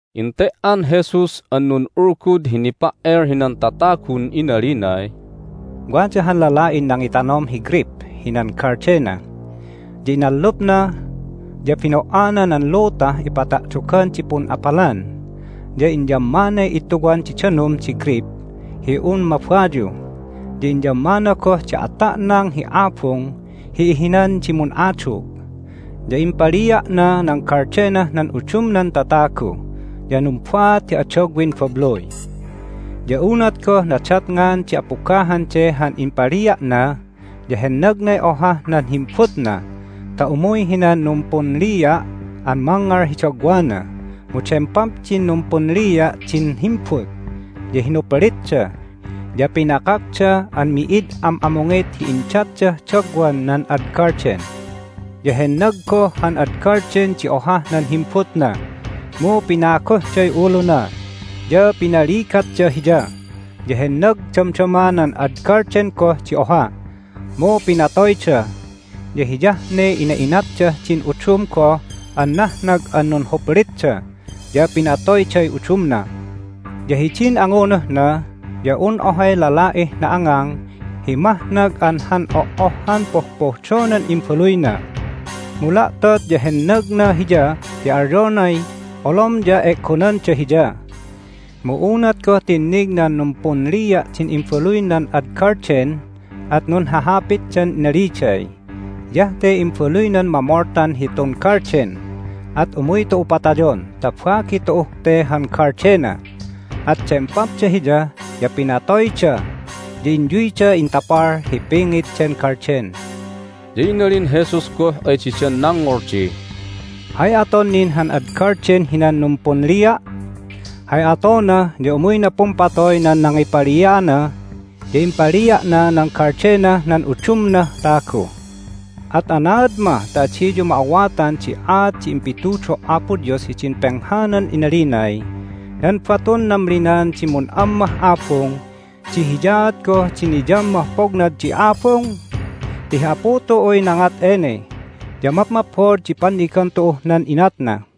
Ente"an Jesus an nun'ulgud hi nipa"el hinan tatagun inalinay, "Wada han lala'in nangitanom hi greyp hinan galdena. Ya inallupna, ya bino"ana nan lutah ipata'dogan di pun'apalan, ya inyammanay ittuwan di danum di greyp hi un mabayu, ya inyammana goh di ata'nang hi abung hi ihinan di mun'adug. Ya impalia'na nan galdenah nan udumnan tatagu, ya numbaat hi adagwin babluy. Ya unat goh nadatngan di apugahan de han impalia'na ya hennagnay ohah nan himbutna ta umuy hinan numpunlia' an mangngal hi dagwana. Mu dempap din numpunlia' din himbut, ya hinuplitda, ya pinakakda an mi'id am'amungit hi indatdah dagwan nan ad galden. Ya hennag goh han ad galden di ohah nan himbutna, mu pinaguhday uluna, ya pinaligatda hiya. Ya hennag damdama nan ad galden goh di oha, mu pinatoyda, ya hiyah ne ina'inatdah din udum goh an nahnag an nunhuplitda, ya pinatoyday udumna. Ya hidin angunuhna ya un ohay lala'ih na'angang hi mahnag an han oh'ohhan pohpohdonan imbaluyna. Mu la'tot ya hennagna hiya ti alyonay, Olom ya e'gonanda hiya! Mu unat goh tinnig nan numpunlia' din imbaluy nan ad galden at nunhahapitdan inaliday, Hiyah te imbaluynan mamoltan hitun galden! At umuy tu'u patayon ta bagi tu'uh te han galdena! At dempapda hiya, ya pinatoyda, ya inyuyda intapal hi pingit den galden." Ya inalin Jesus goh ay didan nangngol di, "Hay aton nin han ad galden hinan numpunlia'? Hay atona ya umuyna pumpatoy nan nangipalia'ana, ya impalia'na nan galdenah nan udumnah tagu. At anaad mah ta adiyu ma'awatan di aat di impitudo' Apo Dios hidin penghanan inalinay, Nan batun namlinan di mun'ammah abung di hiyaat goh di niyammah pognad di abung? Ti hi Apu tu'uy nangat ene, ya mapmaphod di pannigan tu'uh nan inatna!"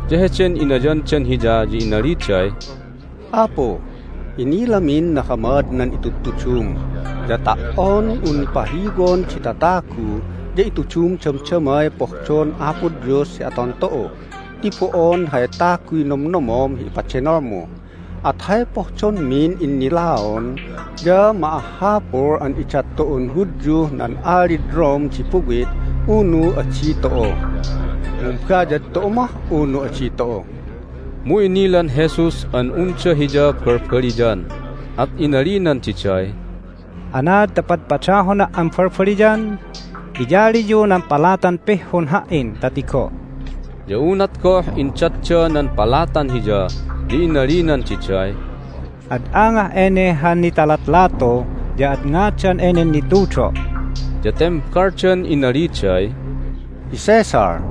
Ya heden inayandan Hiya ya inaliday, "Apu, inilamin nahamad nan itudutudum, ya ta"on un pahiwon di tatagu ya itudum damdamay pohdon Apo Dios hi aton tu'u ti bo'on hay taguy nomnomom hi ipadenolmu. At hay pohdonmin innilaon ya ma'ahhapul an idat tu'un Hudyuh nan alid Rome di buwit, unu adi tu'u? Mumbayad tu'u mah, unu adi tu'u?" Mu inilan Jesus an unda Hiya balbaliyan, at inalinan diday, "Anaad ta padpadahona' an balbaliyan? Iyaliyu nan palatan pihhun Ha"in ta tigo'." Ya unat goh indatda nan palatan Hiya ya inalinan diday, "Ad angah ene han nitalatlatu, ya ad ngadan enen nitudo'?" Ya tembaldan inaliday, "Hi Caesar."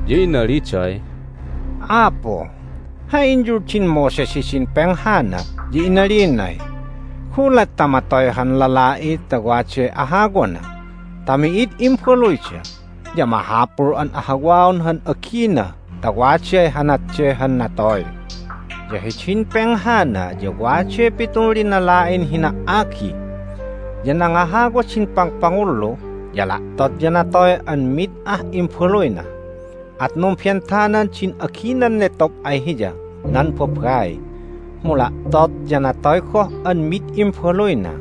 ya inaliday, "Apu, hay inyuldin Moses hidin penghana ya inalinay, Gulat ta matoy han lala'i ta waday ahawana ta mi'id imbaluyda ya mahapul an ahawaon han agina ta waday hanat de han natoy. Ya hidin penghana ya waday pitun linala'in hina"agi. Ya nangahawa din pangpangullu, ya la'tot ya natoy an mid ah imbaluyna. At numbentanan din aginan netob ay hiya nan babai, mu la'tot ya natoy goh an mid imbaluyna.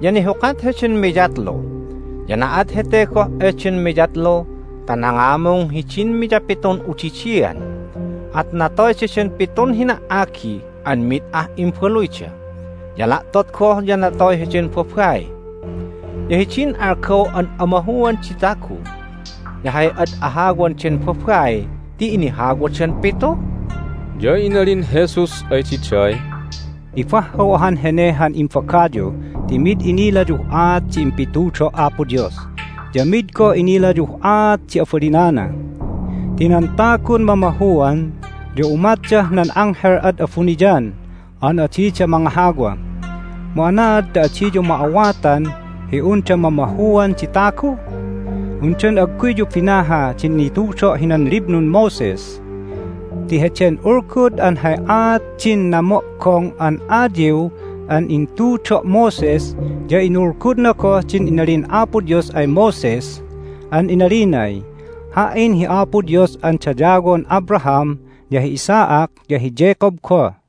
Ya nihukat heden miyatlu. Ya na'at hete goh eden miyatlu ta nangamung hidin miyapitun udidian, at natoy daden pitun hina"agi an mi'id ah imbaluyda. Ya la'tot goh ya natoy heden babai. Ya hidin algaw an amahuan di tagu ya hay ad ahawan den babai ti inahawadan pitu?" Ya inalin Jesus ay diday, "Nibahhaw ahan hene han imbagayu ti mi'id inilayuh aat di impitudo' Apo Dios, ya mi'id goh inilayuh aat di abalinana! Ti nan tagun mamahuan ya umatdah nan anghel ad abuniyan an adida mangahawa. Mu anaad ta adiyu ma'awatan hi unda mamahuan di tagu? Undan agguyyu binaha din nitudo' hinan Liblun Moses? Ti heden ulgud an hay aat din namo'gong an ayiw an intudo' Moses ya inulgudna goh din inalin Apo Dios ay Moses an inalinay, Ha"in hi Apo Dios an dayawon Abraham, ya hi Isaac, ya hi Jacob goh.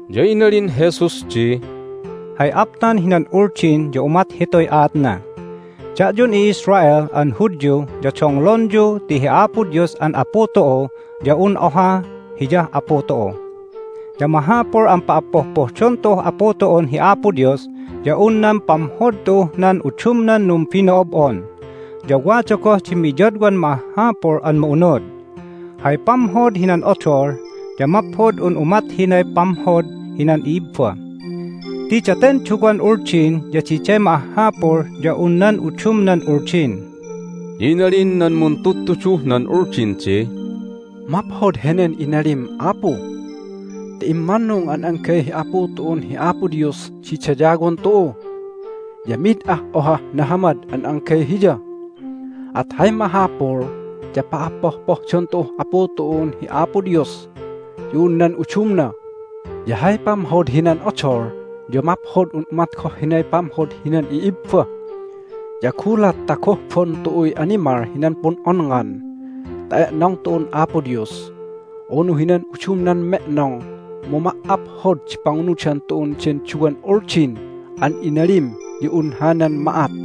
Ya inalin Jesus di, "Hay aptan hinan Uldin ya umat hituy aatna: Da'yun i'Israel an Hudyu ya donglonyu ti hi Apo Dios an Apu tu'u ya un oha Hiyah Apu tu'u. Ya mahapul an pa'appohpohdon tu'uh Apu tu'un hi Apo Dios ya un nan pamhod tu'uh nan udumnan numbino'ob'on. Ya wada goh di miyadwan ma'ahhapul an ma'unud: Hay pamhod hinan odol ya maphod un umat hinay pamhod hinan i'ibba. Ti daten duwan Uldin ya diday ma'ahhapul ya un nan udumnan Uldin." Ya inalin nan muntudtuduh nan Uldin di, "Maphod henen inalim, Apu! Ti immannung an anggay hi Apu tu'un hi Apo Dios di dayawon tu'u, ya mid ah ohah nahamad an anggay Hiya. At hay mahapul ya pa'appohpohdon tu'uh Apu tu'un hi Apo Dios ya un nan udumna, ya hay pamhod hinan odol ya maphod un umat goh hinay pamhod hinan i'ibba. Ya gulat ta gohbon tu'uy animal hinan pun'onngan ta e'nong tu'un Apo Dios unu hinan udumnan me'nong mu ma"aphod di pangunudan tu'un den duwan Uldin an inalim ya un hanan ma'at."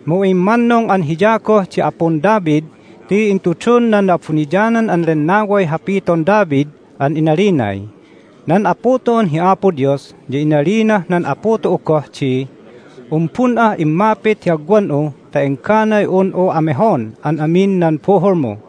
Mu immannung an Hiya goh di Apun David ti intudun nan Na'abuniyanan an Lennaway hapiton David an inalinay, Nan Apu tu'un hi Apo Dios ya inalinah nan Apu tu'u goh di: Umbun'ah immapit hi agwan'u ta engganay un'u amehon an amin nan buhulmu."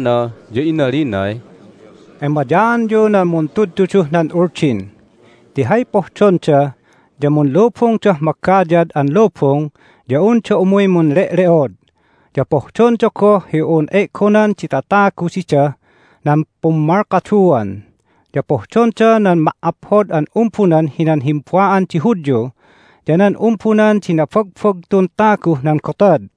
Ya heden nuntudtuduwana ya inalinay, "Emayaanyu nan muntudtuduh nan Uldin! Ti hay pohdonda ya munlubungdah magayad an lubung ya unda umuy munle'le'od, ya pohdonda goh hi un e'gonan di tatagu didah nan pummalkaduan, ya pohdonda nan ma"aphod an umbunan hinan himba'an di Hudyu ya nan umbunan di nabagbagtun taguh nan gotad,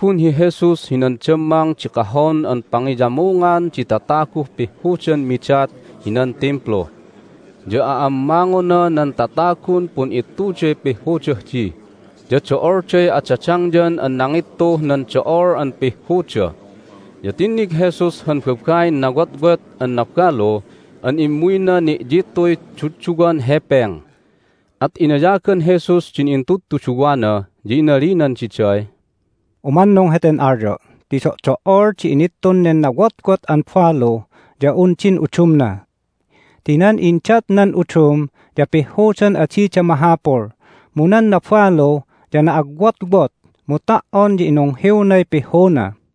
Inumbun hi Jesus hinan dammang di kahon an pangiyamungan di tataguh pihhudan midat hinan Timplu. Ya a'ammangona nan tatagun pun'ittuday pihhudah di, ya do'olday adadangyan an nangittuh nan do'ol an pihhuda. Ya tinnig Jesus han babain nawotwot an nabalu an immuyna ni'yittuy dudduwan hepeng. At inayagan Jesus din intudtuduwana, ya inalinan diday, "Umannung heten alyo' ti do'do"ol di inittun nen nawotwot an balu ya un din udumna! Ti nan indat nan udum ya pihhudan adida mahapul, mu nan nabalu ya na'agwotwot, mu ta"on ya inunghiwnay pihhuna."